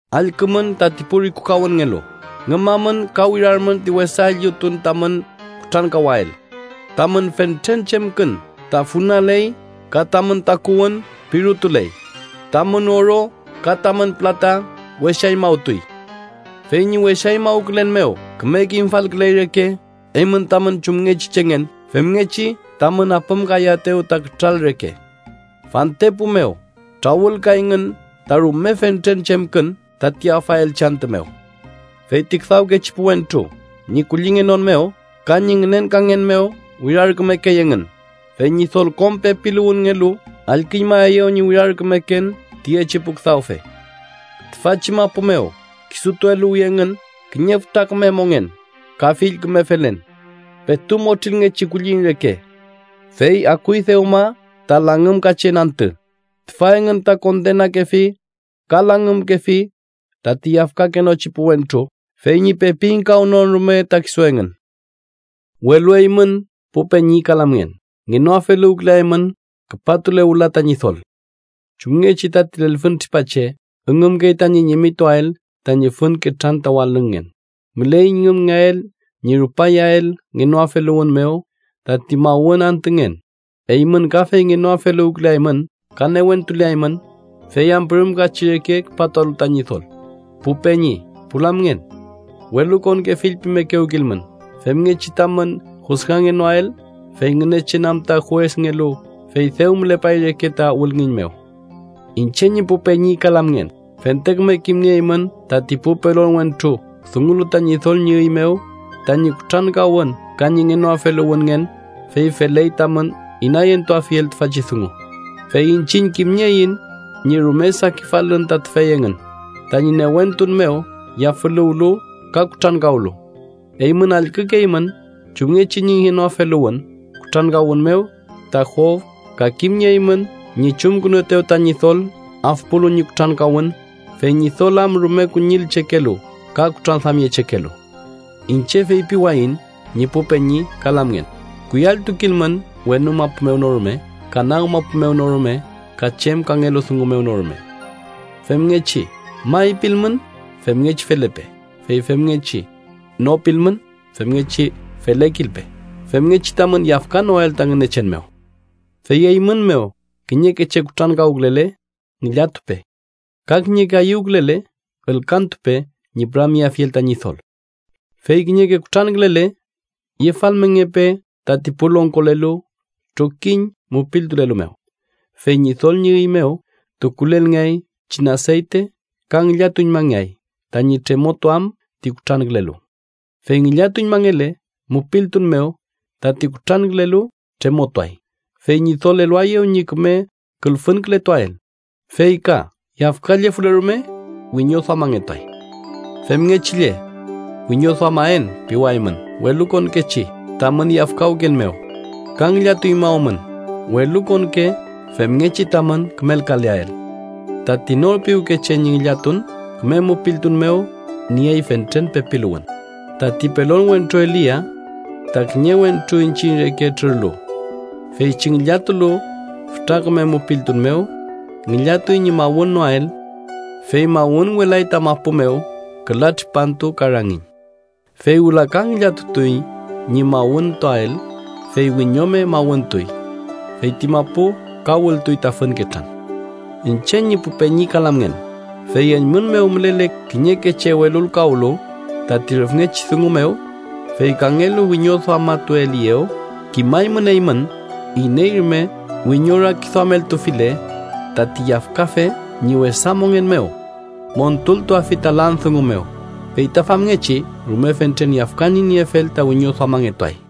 ¡Allkümün tati pu rikukawünngelu! ¡Ngümamün ka wirarmün ti wesa üllüfün tamün kutrankawael! Tamün fentren chemkün ta funaley ka tamün takuwün pirutuley. Tamün oro ka tamün pülata wesañmawtuy. Fey ñi wesañmawkülen mew küme kimfalküley reke eymün tamün chumngechi chengen femngechi tamün apümkayaetew ta kütral reke. Fantepu mew trawülkayngün ta rume fentren chemkün tati afaelchi antü mew. Feyti küdawkechi pu wentru ñi kullingenon mew ka ñi ngünenkangen mew wirarkümekey engün, fey Ñidol kom pepiluwünngelu allküñmaeyew ñi wirarkümeken tüyechi pu küdawfe. Tüfachi mapu mew kisutu eluwi engün kiñe fütra küme mongen ka fill küme felen, petu motrilngechi kulliñ reke, ¡fey akuy dewma ta langümkachen antü! Tüfa engün ta kondenakefi ka langümkefi tati yafkakenochi pu wentru fey ñi pepi ingkawnon rume ta kisu engün. Welu eymün pu peñi ka lamngen ngenoafeluwküleaymün küpatule wüla ta Ñidol. Chumngechi tati lelfüntripa che üngümkey tañi ñimituael tañi fün ketran ta walüngngen, müley ñi üngümael ñi rupayael ngenoafeluwün mew tati mawün antüngen. Eymün kafey ngenoafeluwküleaymün ka newentuleaymün, fey am pürümkachi reke küpatualu ta Ñidol. Pu peñi, pu lamngen, welukonke fillpimekewkilmün, femngechi tamün jusgangenoael, fey Ngünechen am ta juesngelu fey dew mülepay reke ta wülngiñ mew. Iñche ñi pu peñi ka lamngen, fente küme kimnieymün tati pu pelon wentru dungulu ta Ñidol ñi üy mew tañi kutrankawün ka ñi ngenoafeluwünngen, fey feley tamün inayentuafiel tüfachi dungu. Fey iñchiñ kimnieiñ ñi rume sakifalün ta tüfey engün tañi newentun mew yafüluwlu ka kutrankawlu. Eymün allkükeymün chumngechi ñi ngenoafeluwün kutrankawün mew ta Job ka kimnieymün ñi chumkünuetew ta Ñidol afpulu ñi kutrankawün, fey Ñidol am rume kuñillchekelu ka kutranduamyechekelu. Iñche feypiwayiñ ñi pu peñi ka lamngen, kuyalltukilmün wenu mapu mew no rume, ka nag mapu mew no rume ka chem kangelu dungu mew no rume. Femngechi “may” pilmün, femngechi felepe. Fey femngechi “no” pilmün, femngechi felekilpe, femngechi tamün yafkanoael ta Ngünechen mew. Fey eymün mew, kiñeke che kutrankawkülele, ngillatupe. Ka kiñeke ayüwkülele, ülkantupe ñi püramyeafiel ta Ñidol. Fey kiñeke kutrankülele, yefalmengepe tati pu longkolelu trokiñ mupiltulelu mew, fey Ñidol ñi üy mew tukulelngeay pichin aseyte ka ngillatuñmangeay tañi tremotuam ti kutrankülelu. Fey ngillatuñmangele mupiltun mew tati kutrankülelu tremotuay, fey Ñidol eluaeyew ñi küme külfünkületuael. Fey ka yafkallefule rume, wiñoduamangetuay. Femngechi lle, “wiñoduamaen” piwaymün welukonkechi tamün yafkawken mew, ka ngillatuñmawmün welukonke femngechi tamün kümelkaleael. Tati nor piwke che ñi ngillatun küme mupiltun mew niey fentren pepiluwün. Tati pelon wentru Elia ta kiñe wentru iñchiñ reke trürlu. Feychi ngillatulu fütra küme mupiltun mew, ngillatuy ñi mawünnoael, fey mawünwelay ta mapu mew küla tripantu ka rangiñ. Fey wüla ka ngillatutuy ñi mawüntuael, fey wiñome mawüntuy. Fey ti mapu ka wültuy ta fün ketran. Iñche ñi pu peñi ka lamngen, fey eymün mew mülele kiñeke che welulkawlu tati rüfngechi dungu mew, fey kangelu wiñoduamatueliyew, kimaymün eymün, iney rume wiñorakiduameltufile tati yafkafe ñi wesa mongen mew, montultuafi ta lan dungu mew. Fey ta famngechi rume fentren yafkan ñi niefel ta wiñoduamangetuay.